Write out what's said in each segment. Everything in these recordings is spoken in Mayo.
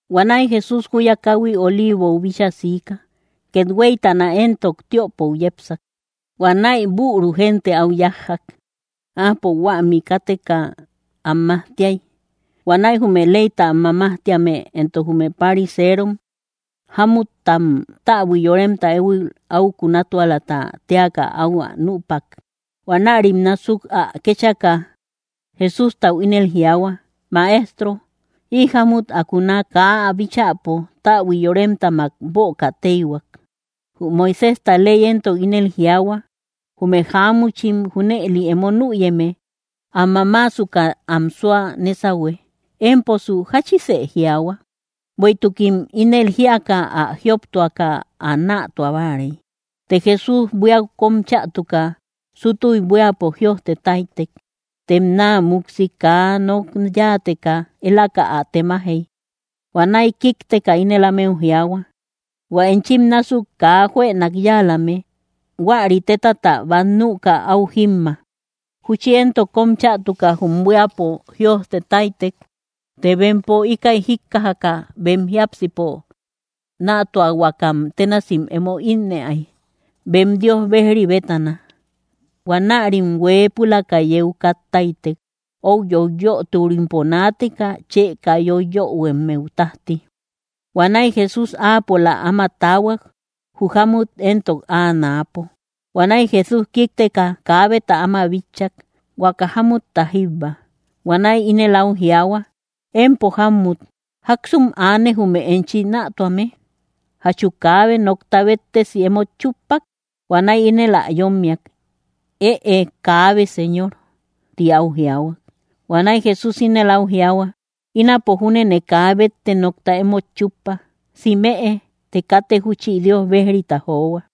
Huanäi Jesús júya káhui Oliivou bíchaa siika. Kethueytana éntok tiöpou yepsak. Huanäi büru génte áu yájjak. Áapo huämi káteka am majtiay. Huanäi jume leyta am mamajtíame éntok jume pariseerom jámuttam täbui yoremta éhuil áu kunatualata téaka áu ä nüpak. Huanärim násuk ä kéchaka, Jesústau ínel jiaahua: —Maestro, ï jámut ä kuna kaa ä bíchäpo täbui yoremtamak böka téihuak. Jü Moiséjta ley éntok ínel jiaahua: Jume jáamuchim junëli emo nüyeme am mamaasuka am súa nésahue. Émposu, ¿jáchise jiaahua? Bueïtukim ínëli jíaka, ä jioptuaka ä nätua báarey. Të Jesús, buíau kóm chätuka, súttuy buíapo jïojte táytek. Tem naa múksi kaa nok yáateka, élaka ä temajey. Huanäi kíkteka ínel ámeu jiaahua: —Huä enchim násuk kaa juënak yáalame, huäri tétata bát nüka áu jímma. Júchi éntok kóm chätuka jum buíapo jïojte táytek. Të bempo, íkäi jíkkajaka, bem jiápsipo nätuahuakame bénasim emo ínnëay, bem Dios bejri bétana. Huanärim hueepulaka yeu kat táytek, ou yoiyöturimpo naateka chë kaa yoiyöhuemmeu tájti. Huanäi Jesús áapola áma taahuak, jü jámut éntok áa náapo. Huanäi Jesús kíkteka, kaabeta áma bitchak, huaka jámutta jíbba. Huanäi ínel áu jiaahua: —Empo jámmut, ¿jáksum aane jume enchi nätuame? ¿Jachu kaabe nokta béttesi emót chúppak? Huanäi ínel ä yómmiak: —Ëe, kaabe, Señor —ti áu jiaahua. Huanäi Jesús ínel áu jiaahua: —Ínapo júnene kaa bétte nokta emót chúppa. Simëe, të katë júchi Dios bejrita johua.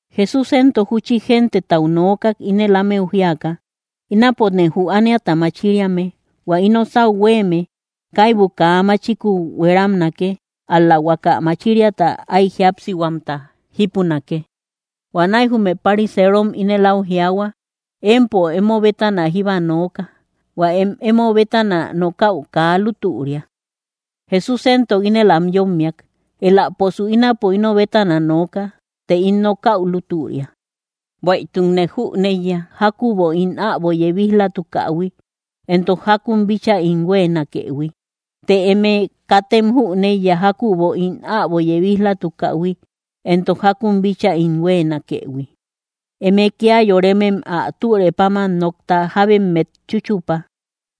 Jesús éntok júchi gentetau nookak, ínel ámeu jíaka: —Ínapone jü ániata machiriame; hua ino sáu huéeme kaibu kaa machiku hueramnake, ál‑la huaka machiriata áy jíapsihuamta jípunake. Huanäi jume pariseerom ínel áu jiaahua: —Empo emo bétana jíba nooka. Huä em emo bétana nokäu kaa lútüria. Jesús éntok ínel am yómmiak: —Eläposu ínapo ino bétana nooka, të ín nokäu lútüria; bueïtukne jüneiya jákübo ín äbo yebij‑latukähui, éntok jákun bíchaa ín huéenakëhui. Të eme katem jüneiya jákübo ín äbo yebij‑latukähui, éntok jákun bíchaa ín huéenakëhui. Eme kía yoremem ä türë páman nokta jábemmet chúchupa.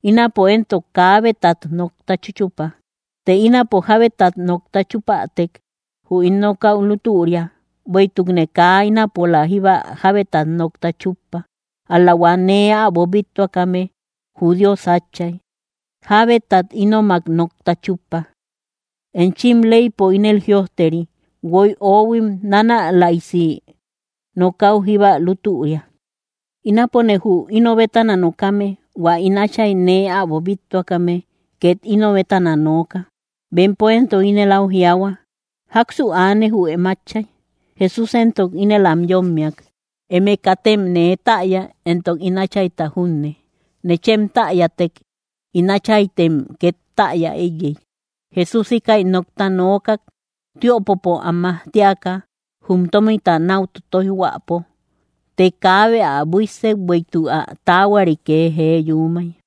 Ínapo éntok kaabetat nokta chúchupa. Të ínapo jábetat nokta chúpätek, jü ín nokäu lútüria; bueïtukne kaa ínapola jíba jábetat nokta chúppa. Ál‑la hua nee äbo bíttuakame, jü Dios Átchay, jábetat ínomak nokta chúppa. Enchim leypo ínel jïojteri: Guoy oóhuim nánälaisi nokäu jíba lútüria. Ínapone jü ino bétana nokame; hua ín Átchay nee äbo bíttuakame két ino bétana nooka. Bempo éntok ínel áu jiaahua: —¿Jáksu aane, jü em Átchay? Jesús éntok ínel am yómmiak: —Eme katem nee täya, éntok ín Áchayta junne. Nechem täyätek, ín Áchaytem két täya éiyey. Jesús íkäi nokta nookak, tiöpopo am majtiaka jum tómita náu totoijhuäpo. Të kaabe ä buíssek, bueïtuk ä taahuari kee jee yuumay.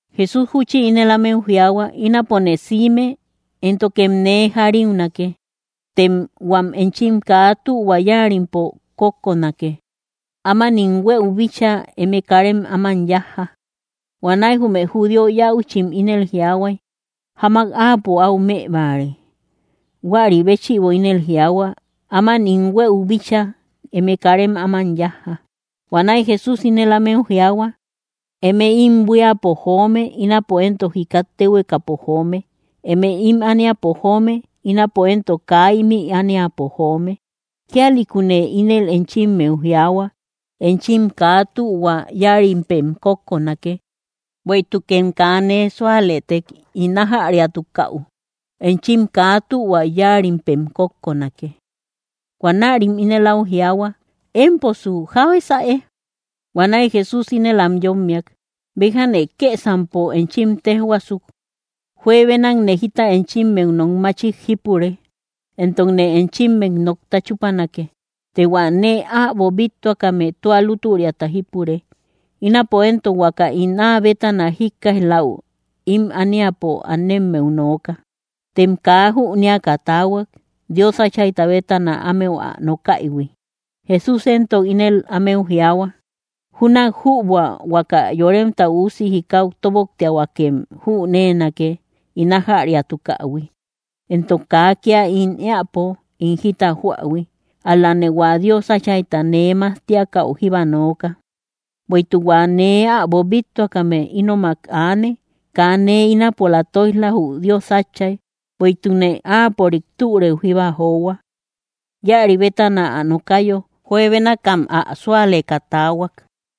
Jesús júchi ínel ámeu jiaahua: —Ínapone siime, éntokem nee jariunake; tem huam enchim kaa tühua yáarimpem kókkonake. Áman ín huëu bíchaa, eme karem áman yájja. Huanäi jume judío yäuchim ínel jiaahuay: —¿Jamak áapo áu më báare? Huäri béchïbo ínel jiaahua: “Áman ín huëu bíchaa, eme karem áman yájja.” Huanäi Jesús ínel ámeu jiaahua: —Eme ím buíapo joome; ínapo éntok jikat téhuekapo joome. Eme ím ániapo joome; ínapo éntok kaa ímï ániapo joome. Kíalïkune ínel enchimmeu jiaahuak: Enchim kaa tühua yáarimpem kókkonake. Bueïtukem kaa nee súalëtek ín ájäriatukäu, enchim kaa tühua yáarimpem kókkonake. Huanärim ínel áu jiaahua: —Émposu, ¿jábesäe? Huanäi Jesús ínel am yómmiak: —Béjane kësampo enchim téjhuaasuk. Juebenakne jita enchimmeu nok machik jípure, éntokne enchimmet nokta chúpanake. Të hua nee äbo bíttuakame tua lútüriata jípure. Ínapo éntok huaka ín áa bétana jíkkaij‑läu ím ániapo anemmeu nooka. Tem kaa jünéaka taahuak, Dios Áchayta bétana ámeu ä nokaïhui. Jesús éntok ínel ámeu jiaahua: —Júnak jübua huaka Yoremta Üusi jikau tóboktiahuakem jüneenake ín ájäriatukähui, éntok kaa kía ín éäpo ín jita joähui; ál‑lane hua Dios Áchayta nee majtiakäu jíba nooka. Bueïtuk hua nee äbo bíttuakame ínomak aane; kaa nee ínapola tóij‑la, jü Dios Átchay, bueïtukne áapörik türëu jíba johua. Íäri bétana ä nokayo, juebénakam ä súaleka taahuak.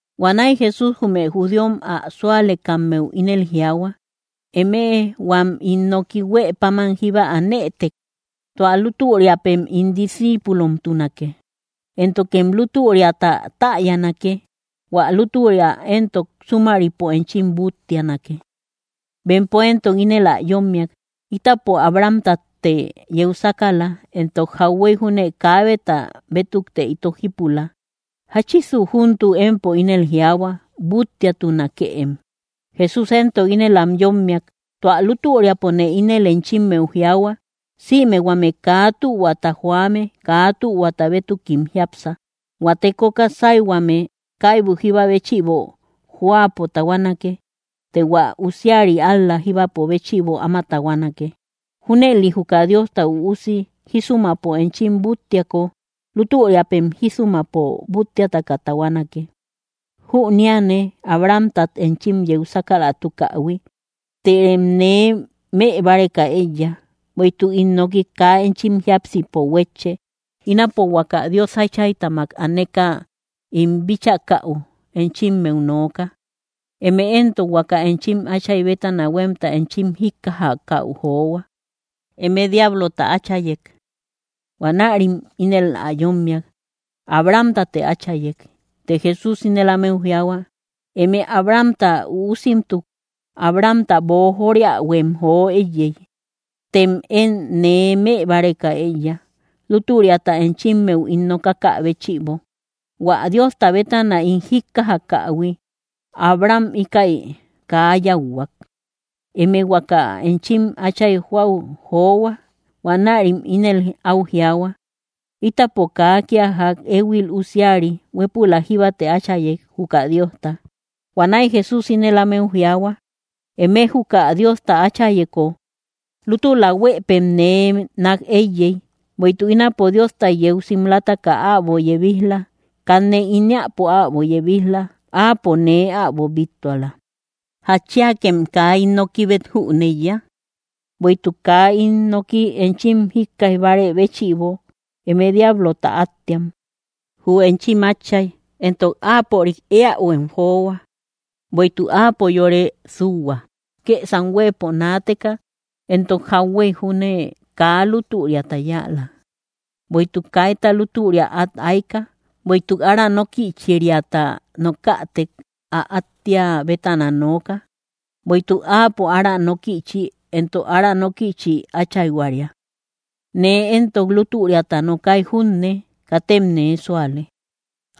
Huanäi Jesús jume judíom ä súalekammeu ínel jiaahua: —Emëe huam ín noki huë páman jíba anëtek, tua lútüriapem ín discíipulomtunake; Éntokem lútüriata täyanake. Huä lútüria éntok súmaripo enchim búttianake. Bempo éntok ínel ä yómmiak: —Ítapo Abrahamtatte yeu sákala, éntok jauhuey júne kaabeta bétukte ito jípula. ¿Jáchisu júntuk empo ínel jiaahua: “Búttiatunakëem”? Jesús éntok ínel am yómmiak: —Tua lútüriapone ínel enchimmeu jiaahua, sïme huame kaa tühuata joame, kaa tühuata bétukim jiápsa. Huä tekoka sáyhuame kaibu jíba béchïbo jóapo tahuanake; të hua usiari ál‑la jíba béchïbo áma tahuanake. Júnëli juka Diosta Üusi jísumapo enchim búttiako, lútüriapem jísumapo búttiataka tahuanake. Jüneane Abrahamtat enchim yeu sákalatukähui; tërem nee mëbáreka éiya, bueïtuk ín noki kaa enchim jiápsipo huétche. Ínapo huaka Dios Áchaytamak aneka ín bíchakäu enchimmeu nooka; eme éntok huaka enchim áchay bétana huémta enchim jíkkajäu johua. Eme diablota áchayek. Huanärim ínel ä yómmiak: —Abrahamtate áchayek. Të Jesús ínel ámeu jiaahua: —Eme Abrahamta üusimtuk, Abrahamta boojoriähuem jo éiyey. Tem én nee mëbáreka éiya, lútüriata enchimmeu ín nokakä béchïbo, hua Diosta bétana ín jíkkajakähui. ¡Abraham íkäi kaa yáuhuak! Eme huaka enchim áchay joäu johua. Huanärim ínel áu jiaahua: —Ítapo kaa kía ják éhuil usiari; huépülak jíbate áchayek, juka Diosta. Huanäi Jesús ínel ámeu jiaahua: —Eme juka Diosta Áchayeko, lútula huëpem nee nák éiyey, bueïtuk ínapo Diostat yeu simlataka äbo yebij‑la. Kanne ín éäpo äbo yebij‑la; áapo nee äbo bíttuala. ¿Jatchiakem kaa ín nokibet jüneiya? Bueïtuk kaa ín noki enchim jíkkaij bárë béchïbo. Eme diablota átteam, jü enchim átchay; éntok áapörik éähuem johua. Bueïtuk áapo yore súhua, kësam huëpo naateka, éntok jauhuey júne kaa lútüriata yáala, bueïtuk kaita lútüria át ayka. Bueïtuk ára nókïchiriata nokätek, ä áttea bétana nooka; bueïtuk áapo ára nókïchi, éntok ára nókïchi áchayhuaria. Nee éntok lútüriata nokay junne, katem nee súale.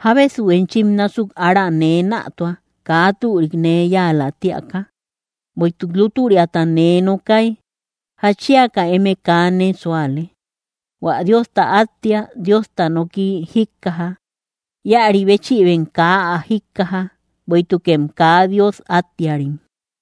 ¿Jábesu enchim násuk ára nee nätua, kaa türik nee yáalä tíaka? Bueïtuk lútüriata nee nokay, ¿jatchiaka eme kaa nee súale? Huä Diosta áttea Diosta noki jíkkaja; íäri béchïbem kaa ä jíkkaja, bueïtukem kaa Dios áttearim.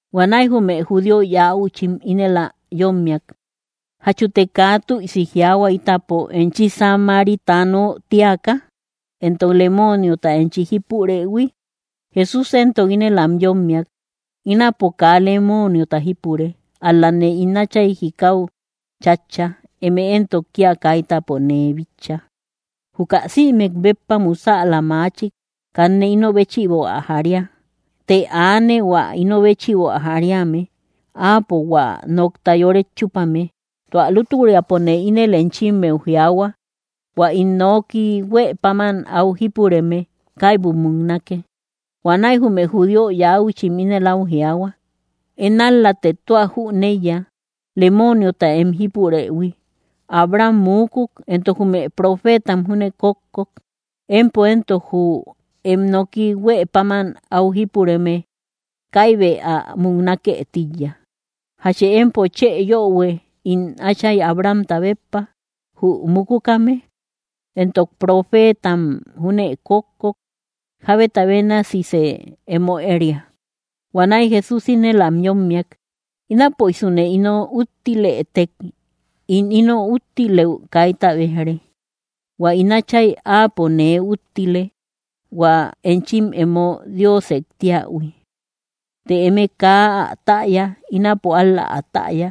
Huanäi jume judío yäuchim ínel ä yómmiak: —¿Jachute kaa tüisi jiaahua ítapo, enchi samaritano tíaka, éntok lemooniota enchi jípurëhui? Jesús éntok ínel am yómmiak: —Ínapo kaa lemooniota jípure. Ál‑lane ín Átchay jikau chátcha; eme éntok kía kaitapo nee bitcha. Juka sïmek béppa musäla machik, kanne ino béchïbo ä jaria. Të aane, hua ino béchïbo ä jariame. Áapo hua nokta yoret chúpame. Tua lútüriapone ínel enchimmeu jiaahua: Huä ín noki huë páman áu jípureme, kaibu muknake. Huanäi jume judío yäuchim ínel áu jiaahua: —Én ál‑late tua jüneiya lemooniota em jípurëhui. Abraham muukuk, éntok jume profeetam júne kókkok. Empo éntok ínel jiaahua: “Jü em noki huë páman áu jípureme, kaibë ä múknake tíiya.” ¿Jachë empo chë yöhue itom áchay Abrahamta béppa, jü mukukame? Éntok profeetam júne kókkok. ¿Jábeta bénasisë emo éria? Huanäi Jesús ínel am yómmiak: —Inapoïsune ino úttilëtek, ín ino úttilëu kaita béj‑re. Huä ín Átchay, Áapo nee úttile, hua enchim emo Diosek tíähui. Të eme kaa ä täya. Ínapo ál‑la ä täya.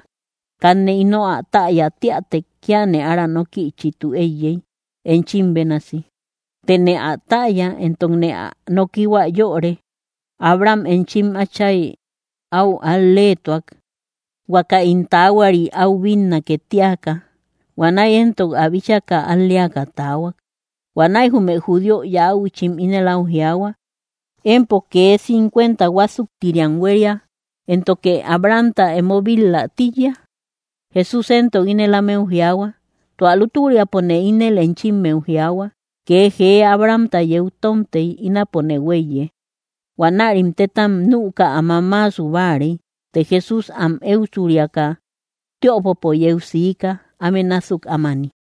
Kanne ino ä täya tíätek, kíane ára nókïchitu éiyey, enchim bénasi. Tëne ä täya, éntokne ä nokihua yöre. Abraham enchim átchay áu al‑leetuak, huaka ín taahuari áu bínnake tíaka. Huanäi éntok ä bíchaka, al‑leaka taahuak. Huanäi jume judío yäuchim ínel áu jiaahua: —Empo kee cincuenta huásuktiriam huéria, ¿éntoke Abrahamta emo bit‑la tíiya? Jesús éntok ínel ámeu jiaahua: —Tua lútüriapone ínel enchimmeu jiaahua: Kee jee Abrahamta yeu tómtey, ínapone huéiye. Huanärim téttam nüka ä mamaasu báarey. Të Jesús am éusuriaka, tiöpopo yeu siika, áme násuk ámani.